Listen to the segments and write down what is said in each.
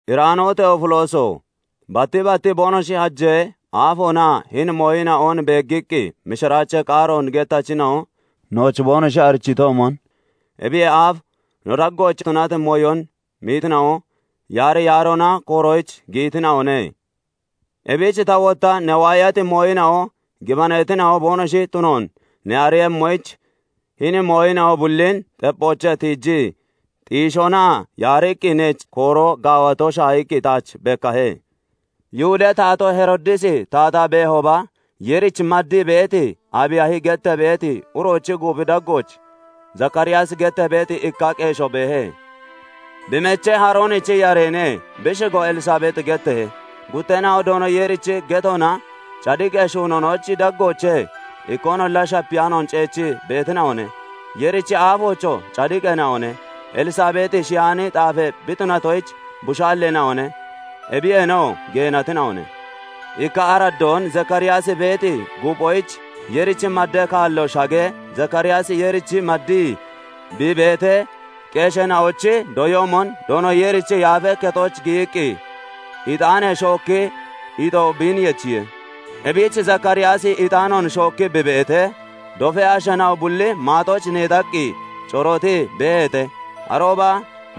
Iraano Teefilooso! batti bat boonoshi hajee aafoona hini mooyina'on beeggiqqi mishiraachee qaaroon gettachina'o nooch boonoshi arichiitoomon, ebiyee aaf no daggooch tunati mooyon meetina'o yaari yaaroona koorooch giyitina'one. Ebich ta wotta ne waayati mooyina'o gibaneetina'o boonoshi tunoon ne ariiyemmoyich, hini mooyina'o bullin xepphoochee tiijii xiishoona yaariqqi neech kooroo gaawato shaahiqqi taach bekkahe. Yihudee taatoo Heroodisi taataa beehooba, Yeerichi maddii (maddaa) beeti Aabiyaahi gettee beeti uroochi guuphi daggooch Zakaariyaasi gettee beeti ikka qeeshoo beehe; bi mechee Haaroonichi yareene; bi shigoo Elsabeexi getteehe. Gutteena'oo Doono Yeerichi getoonaa cadiqee shuunoonochi daggoochee ikkoonolla shapiyaanoon ceechii beetina'one; Yeerichi aafoochoo cadiqeena'one. Elsabeexi shiyaani xaafee bi tunatoyich, bushaalleena'one; ebiyeenoo geenatina'one. Ikka araddoon Zakaariyaasi beeti guuphoyich Yeerich maddee kaalo shaggee, Zakaariyaasi Yeerich maddii (maddaa) bi beetee, qeesheena'ochi doyoomon Doono Yeerichi Yaafee Kexooch giyiqqi ixaanee shookki ixoo biin yechiye. Ebich Zakaariyaasi ixaanoon shookkii bi beetee, dofee asheena'o bulli maaxooch neexaqqi corootii beeheete. Arooba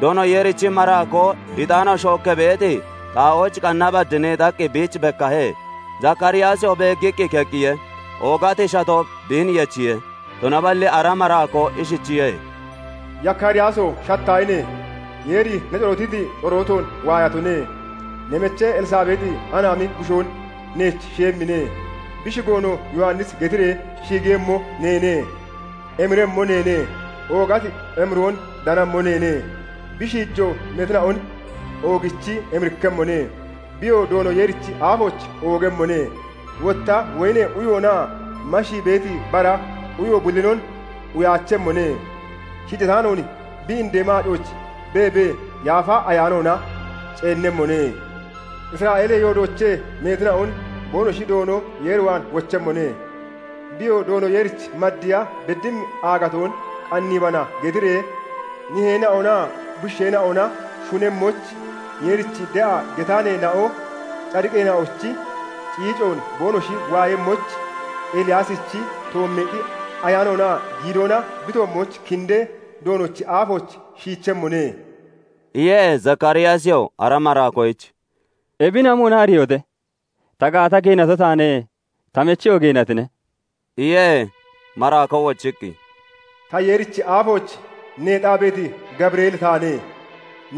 Doono Yeerichi maraakoo ixaano shookkee beeti xaa'oochaa qanna bad neexaqqi biich bekkahe. Zakaariyaasiyoo beeggiqqi keqqiye; oogati shatoo biin yechiye. Tunaballi ara maraakoo ishichiye:- "Yakaariyaaso! Shattaahine! Yeeri ne corootiti corootoon waayatone. Ne mechee Elsabeexi anaami bushoon neech shiyemmine; bi shigoonoo 'Yowannisi' getiree shigiiyemmo neene. Emiremmo neene; oogati emiroon danemmo neene; bi shiijoo meetina'on oogichi emirikkemmone. Biyoo Doono Yeerichi aafooch oogemmone; wotta woyinee uyoonaa mashii beeti bara uyo bullinon uyaachemmone; shiijataanoon bi indee maacooch beebee, Yaafa Ayaanoona ceennemmone. Isra'eelee yoodoochee meetina'on boonoshi Doono Yeer waan wochemmone. Biyoo 'Doono Yeerich maddiya beddimmi aagatoon qanniibana' getiree niheena'onaa bushiisheena'ona shunemmoyich, Yeerich de'a getaaneena'o cadiqeena'ochi ciicoon boonoshi waayemmoyich, Eliyaasichi toommeexi ayaanoonaa giidoona bi toommooch kindee, Doonochi aafooch shiichemmone" iye. Zakaariyaasiyoo ara maraakoyich "Ebin amoona ariiyehote? Ta gaata geenato taane; ta mecheyoo geenatine" iye. Maraakoo wochiqqi, "Ta Yeerichi aafooch neexaa beeti Gabireeli taane;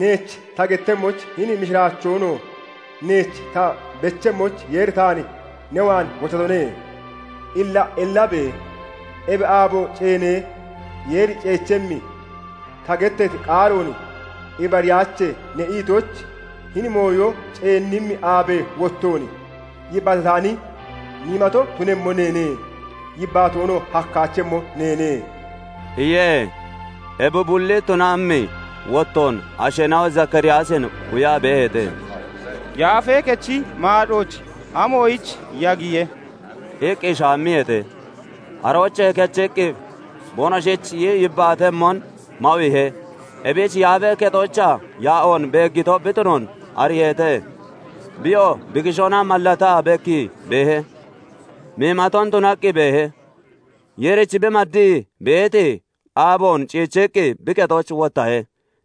neech ta gettemmoyich, hini mishiraachoonoo neech ta bechemmoyich Yeeri taan ne waan wochatone. Illa ellabe! Ebi aabo ceenee Yeeri ceechemmi, ta gettati qaaroon 'Ibariyaache' ne itoyich, hini mooyo ceennimmi aabee wottoon yibbaatataani miimato tunemmo neene; yibbaatoonoo hakkaachemmo neene" iye. Ebi bulli tunammi wottoon asheena'o Zakaariyaasin quyaa beeheete; "Yaafee Kechi maacooch amoyich yagiye?" iqqi shaammiyeete. Aroochee kechiqqi boonoshich yibbaatemmon mawiihe. Ebich Yaafee Kexoochaa yaa'oon beeggito bi tunoon ariiheete. Biyoo bi kishoona mallataa bekkii beehe; miimaton tunaqqi beehe. Yeerich bi maddii (maddaa) beeti aaboon ciichiqqi bi kexooch wottahe.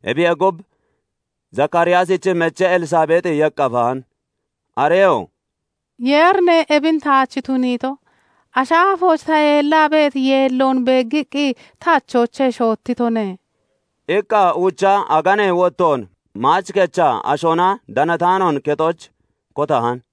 Ebiyee gub, Zakaariyaasichi mechee Elsabeexi yeqqafahan; areyoo "Yeerine ebin taach tuniito; ashi aafooch ta yeellaa beeti yeelloon beeggiqqi ta achoochee shoottitone" iqqa uucha aganee wottoon maach kechaa ashoona danataanoon kexooch kotahan.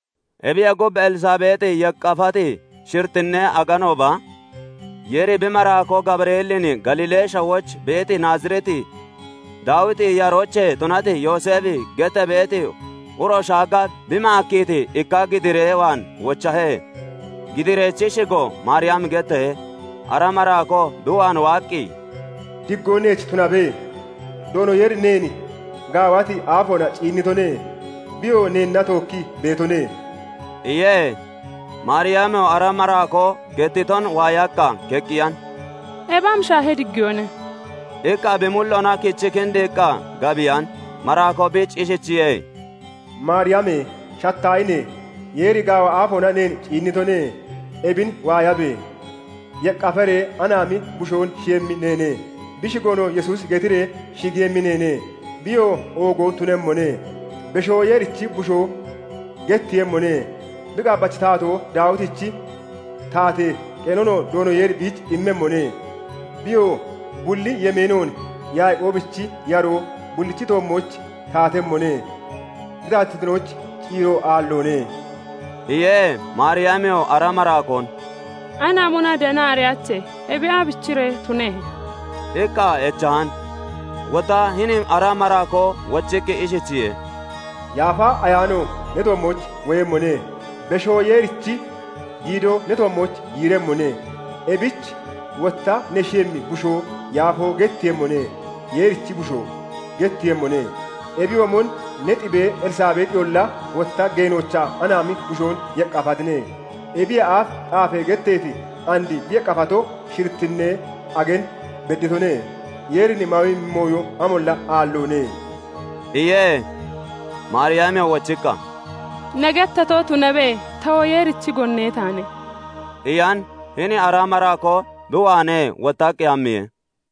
Ebiyee gub, Elsabeexi yeqqafati shirittinee aganooba Yeeri bi maraakoo Gabireelin Galiilee shawooch beeti Naazireet, Daawiti yaroochee tunati Yooseefi gettee beeti uro shaagga bi maakkiiti ikka gidiiree (giddiidee) waan wochahe; gidiirechi shigoo Maariyami getteehe. Ara maraakoo bi waan waaqqi, "Digoo neech tunabe! Doono Yeeri neen gaawati aafoona ciinnitone; biyoo neenna tookkii beetone" iye. Maariyamiyoo ara maraakoo gettiton waayaqqa keqqiyan; "Ebi amashee diggiyoone?" iqqa bi mulloona kichii kindiiqqa gabiyan. Maraakoo biich ishichiye:- "Maariyame! Shattaahine! Yeeri gaawa aafoona neen ciinnitone. Ebin waayabe! Yeqqafaree anaami bushoon shiyemmi neene; bi shigoonoo 'Yesuusi' getiree shigiiyemmi neene. Biyoo oogo tunemmone; Beshoo Yeerichi Bushoo getteeyemmone; bi qaabbachi taatoo Daawitichi taatee qeenonoo Doono Yeeri biich immemmone; Biyoo bulli yemeenoon Yaaqoobichi yaroo bullichi toommooch taatemmone; bi taatittinoyich ciiro aalloone" iye. Maariyamiyoo ara maraakoon, "Anaamona danaa ariyaache; ebi aabichiree tunehe?" iqqa echan. Wotta hini ara maraakoo wochiqqi ishichiye:- "Yaafa Ayaano ne toommooch woyemmone; Beshoo Yeerichi giidoo ne toommooch yiiremmone; ebich wotta ne shiyemmi bushoo 'Yaafoo' getteeyemmone; 'Yeerichi Bushoo' getteeyemmone. Ebiyoomon ne xibee Elsabeexiyolla wotta geenoochaa anaami bushoon yeqqafatine; ebiyee aaf xaafee getteeti and bi yeqqafato shirittinee agan bedditone. Yeerin mawemmi mooyo amolla aalloone" iye. Maariyamiyoo wochiqqa, "Ne gettato tunabe; tawoo Yeerichi gone taane" iyan. Hini ara maraakoo bi waanee wottaqqi hammiye.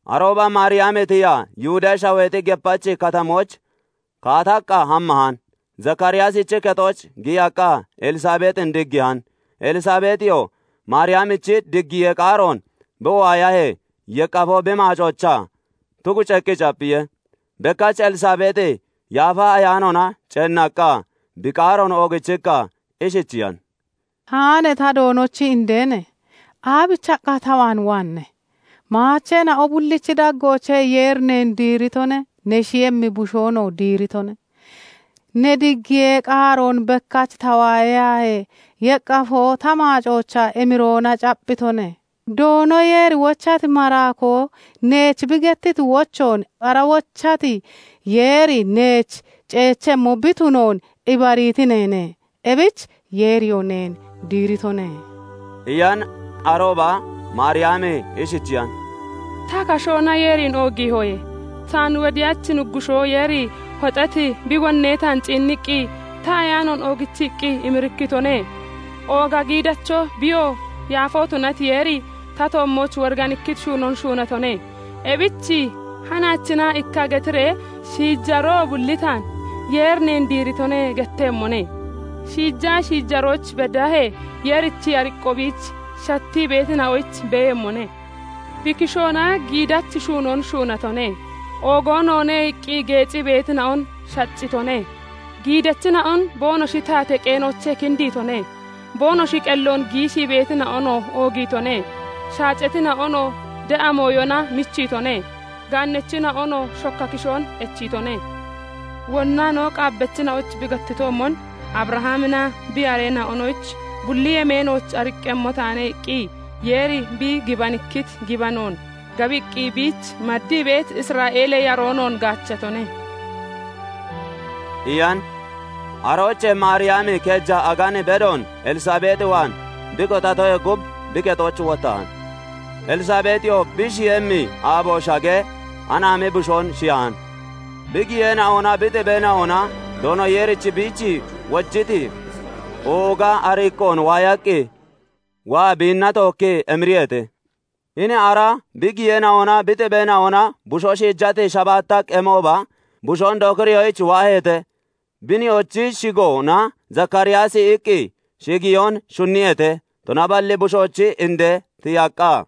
Arooba Maariyami tiyaa Yihudee shaweexi gepachi katamooch kaataqqa hammahan. Zakaariyaasichi kexooch giyaqqa Elsabeexin diggiihan. Elsabeexiyoo Maariyamichi diggiyee qaaroon bi waayahee, yeqqafoo bi maacoochaa tuguceeqqi capphiye; bekkach Elsabeexi Yaafa Ayaanoona ceenaqqa, Bi qaaroon oogichiqqa ishichiyan; "Haane ta Doonochi indeene! Aabichiqqa ta waan waanne? Maacheena'o bullichi daggoochee Yeeri neen diiritone; ne shiyemmi bushoonoo diiritone. Ne diggiyee qaaroon bekkach ta waayahee, yeqqafoo ta maacoochaa emiroona capphitone. Doono Yeeri wochati maraakoo neech bi gettiti wochoon ara wochati Yeeri neech ceechemmo bi tunoon ibariiti neene; ebich Yeeriyoo neen diiritone" iyan. Arooba Maariyami ishichiyan; "Ta kashoona Yeerin oogiihoye; taan wodiyachi Nuggushoo Yeeri hoxeeti bi gonnee taan ciinniqqi ta ayaanoon oogichiqqi emirikkitone. ooga giidacho, biyoo yaafoo tunati Yeeri, ta toommooch woriganikkiti shuunoon tuniitone; ebichi hanaachina ikka getiree shiijaroo bulli taan 'Yeeri neen diiritone' gettemmone. shiijaa shiijarooch beddaahee Yeerichi ariqqo biich shattii beetina'oyich beeyemmone. bi kishoona giidachi shuunoon shuunatone; "oogo noone" iqqi geecii beetina'on shaccitone; giidachina'on boonoshi taatee qeenoochee kindiitone; boonoshi qelloon giishii beetina'onoo oogiitone; shaacatina'onoo de'a mooyona michiitone; gaannachina'onoo shokka kishoon echiitone. wonna no qaabbachina'oyich bi gettitoomon, 'Abrahaminaa bi yareena'onoyich bulli yemeenooch ariqqemmo taane' iqqi Yeeri bi gibanikkiti gibanoon gabiqqi biich maddii (maddaa) beeti Isra'eelee yaroo noon gaachatone" iyan. Aroochee Maariyami keeja agan bedoon Elsabeexi waan bi kotatoyee gub, bi kexooch wottahan. Elsabeexiyoo bi shiyemmi aabo shagee, anaami bushoon shiyahan. Bi giyeena'onaa bi xibeena'ona Doono Yeeri biich wojiti ooga ariqqoon waayaqqi waa biinna tookkii emiriyeete. Hini ara bi giyeena'onaa bi xibeena'ona bushoo shiijati shabaatta qemooba bushoon dokiriyoyich waaheete; bi nihoochi shigoona "Zakaariyaasi" iqqi shigiyoon shunniyeete. Tunaballi bushoochi indee tiyaqqa,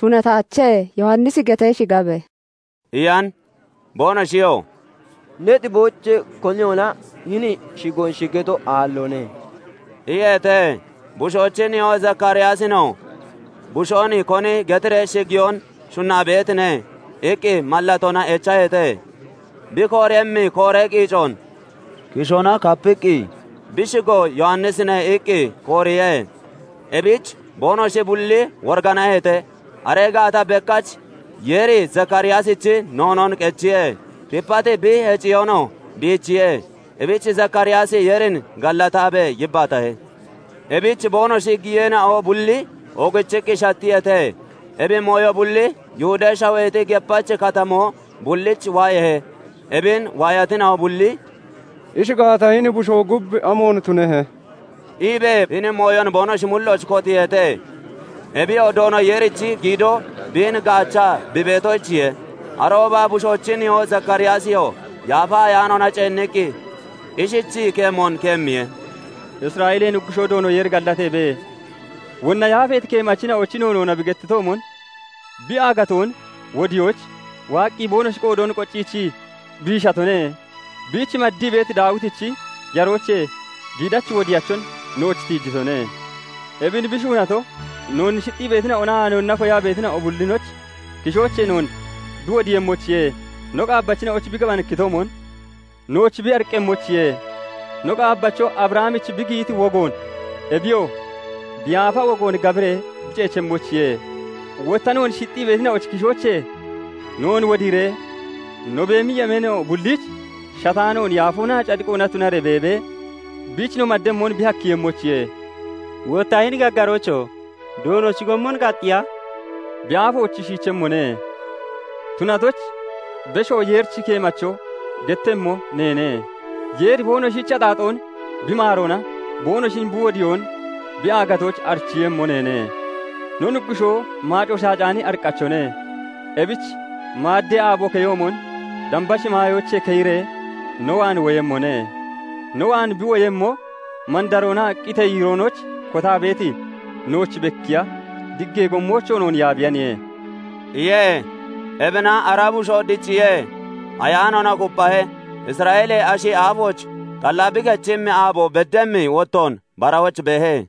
"Tunataache; Yowannisi getee shigabe" iyan. Boonoshiyoo "Ne xiboochee koniyolla hini shigoon shigato aalloone" iyeete. Bushoochi nihoo Zakaariyaasinoo "Bushoon koni getiree shigiyoon shunnaa beetine?" iqqi mallatoona echaheete. Bi kooremmi kooree qiicoon kishoona kapiqqi "Bi shigo Yowannisine" iqqi kooriye. Ebich boonoshi bulli woriganaheete. Aree gaata bekkach Yeeri Zakaariyaasichi noonoon qechiye; tipati bi heciyoonoo biichiye; ebich Zakaariyaasi Yeerin gallataabee yibbaatahe. Ebich boonoshi giyeena'o bulli oogichiqqi shattiyeete. Ebi mooyo bulli Yihudee shaweexi gepachi katamoo bulliich waayeehe. Ebin waayatina'o bulli "Ishi gaata, hini bushoo gub amoon tunehe?" iibee hini mooyon boonoshi mullooch kotiiheete; ebiyoo Doono Yeerichi giido biin gaachaa bi beetoyichiye. Arooba bushoochi nihoo Zakaariyaasiyoo Yaafa Ayaanoona ceenniqqi ishichii keemoon keemmiye; "Isra'eelee Nuggushoo Doono Yeeri gallateebe! wonna yaafeeti keemachina'ochi noonoona bi gettitoomon, bi aagatoon wodiyoyich waaqqi boonoshi qoodoon qocciichii biishatone; biich maddii (maddaa) beeti Daawitichi yaroochee giidachi wodiyachon nooch tiijitone. Ebin bi shuunato, noon shixxii beetina'onaa noonna koyaa beetina'o bullinochi kishoochee noon bi wodiiyemmoyichiye; no qaabbachina'oyich bi gibanikkitoomon, nooch bi ariqqeeyemmoyichiye; no qaabbacho Abrahamich bi giyiti wogoon, ebiyoo bi yaafa wogoon gabiree bi ceechemmoyichiye; wotta noon shixxii beetina'ochi kishoochee noon wodiiree, no beemi yemeeno bulliich shataanoon yaafoonaa cadiqoona tunaree beebee, biich no mademmon bi hakkiiyemmoyichiye. wotta hini gaggaroocho! Doonochi gommon Kaxxiya bi aafooch shiichemmo ne tunatoyich, Beshoo Yeerichi keemacho getteeyemmo neene; Yeeri boonoshi axaaxoon bi maaroona boonoshin bi wodiyoon bi aagatoyich arichiiyemmo neene. no Nuggushoo maaco shaacaani ariqqachone; ebich maaddee aabo keyoomon damba shimaayoochee keyiree no waan woyemmone; no waan bi woyemmo, mandaroonaa qitee yiiroonooch kotaa beeti nooch bekkiiya, diggee gommoochoo noon yaabiyaniye" iye. Ebina ara bushoo dicciye; ayaanoona kupphahe. Isra'eelee ashi aafooch xalla bi kechemmi aabo beddimmi wottoon barahooch beehe.